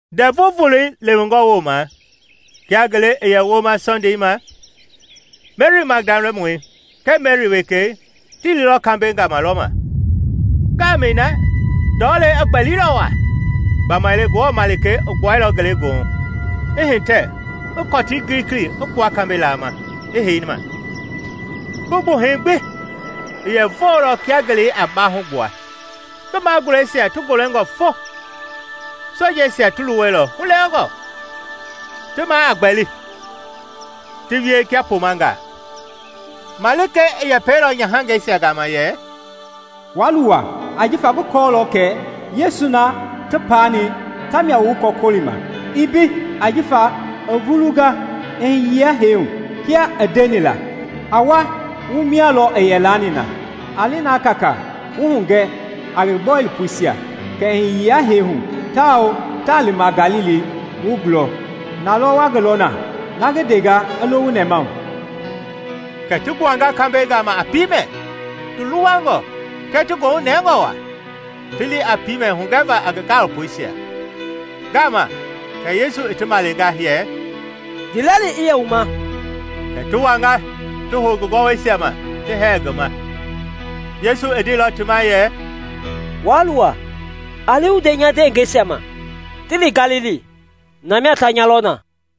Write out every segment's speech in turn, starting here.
Ndɛvu voloi lewengɔ woma, kia ngele i yɛ woma Sɔndei ma, Meri Magdalamɔi kɛɛ Meri wekei ti liilɔ kambɛi gama lɔma. Ngaamɛi na ndɔlei i gbɛlilɔ waa; gbamaile Ngewɔ malikei i gbuailɔ ngelegoohu, i hitɛ i kɔtii gilikili i kpua kambɛi laama, i hei ma. Ngi gbuhɛi gbi i yɛ voolɔ kia ngelei a baahu gbua, ngi magulɛisia ti golengɔ fo fo. Sojeisia ti luwɛilɔ hulewengɔ, ti maa a gbɛli, ti wie kia pomangaa. Malikei i yɛpɛilɔ nyahangɛisia gama yɛ, “Waa luwa; ajifa ngi kɔɔlɔ kɛ Yesu na ti paani tamia wu ngi gɔkɔlima. Ii mbei; ajifa i vulunga i hiyenga hee hu, kia i ndeni la. A wa wu mia lɔ i yɛ laani na. A li na kaakaa wu hugɛ a ngi gaalopoisia kɛ i hiyenga hee hu, tawao taa lima Galili wu gulɔ; na lɔ wa ngi lɔ na. Na ngi ndenga i lo wu nɛmahu.” Kɛ ti gbuanga kambɛi gama a piimɛ, ti luwangɔ kɛɛ ti goohu nɛngɔ waa, ti li a piimɛ hugɛva a ngi gaalopoisia. Ngaama kɛ Yesu i ti malenga yɛ, “Ndiilɛli i yɛ wu ma.” Kɛ ti wanga ti hou ngi gɔwɔisia ma ti hɛɛ ngi ma. Yesu i ndeilɔ ti ma yɛ, “Waa luwa; a li wu nde nya ndewengeisia ma ti li Galili, na mia ta nya lɔ na.”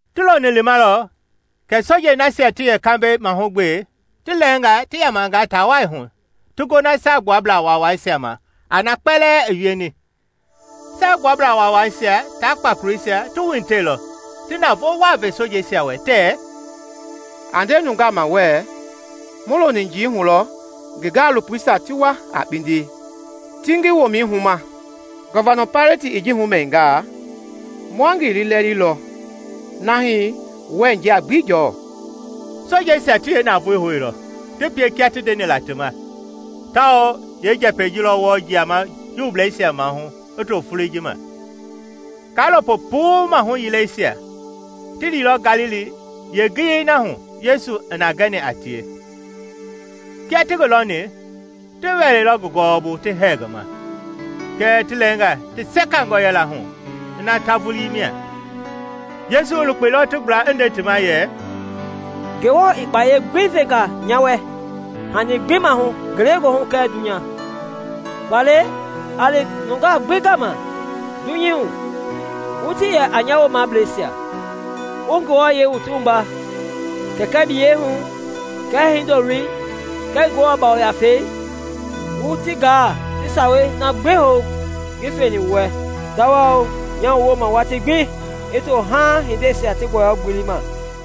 Ti loni limalɔ kɛ sojei nasia ti yɛ kambɛi mahugbe ti lɛɛnga ti yamanga taa wai hu ti gona Saagbuablaa Waawaisia ma a na kpɛlɛɛ i wieni. Saagbuablaa Waawaisia tia kpakoleisia ti wuhitɛilɔ, ti navoo waa ve sojeisia wɛ tɛɛ, “A nde nungaa ma wɛɛ, ‘Mu loni njii hu lɔ ngi gaalopoisia ti wa a kpindi ti ngi womɛi huma.’ Gɔvinei Paileti i ji humɛningaa, ma ngi liilɛlilɔ na hii wɛɛ njia gbi jɔɔ.” Sojeisia ti yeenavoei houilɔ, ti pie kia ti ndeni la ti ma; tawao yeenjɛpɛi ji lɔ wɔɔ jiama Juubleisia maahu i to foloi ji ma. Kaalopo puu maahu yileisia ti liilɔ Galili yeengiyei na hu Yesu i na gɛni a tie. Kia ti ngi lɔni, ti wɛleilɔ ngi gɔwɔbu ti hɛɛ ngi ma, kɛɛ ti lɛɛnga ti sekangɔ yɛla hu ina ta vulii mia. Yesu i lukpeilɔ ti gbla i nde ti ma yɛ, “Ngewɔ i kpayei gbi venga nya wɛ hani gbi maahu ngelegoohu kɛɛ dunya. Faale, a li nungaa gbi gama dunyei hu, wu ti yɛ a nya woomableisia, wu ti wua Kɛkɛi biyɛi hu kɛɛ Hindoloi kɛɛ Ngewɔ Ngafɛi, wu ti gaa ti sawei na gbi hou ngi feni wu wɛ; tawao nyaa wu wooma watii gbi i to haa-hindeisia ti gbɔyɔ-gbelei ma.”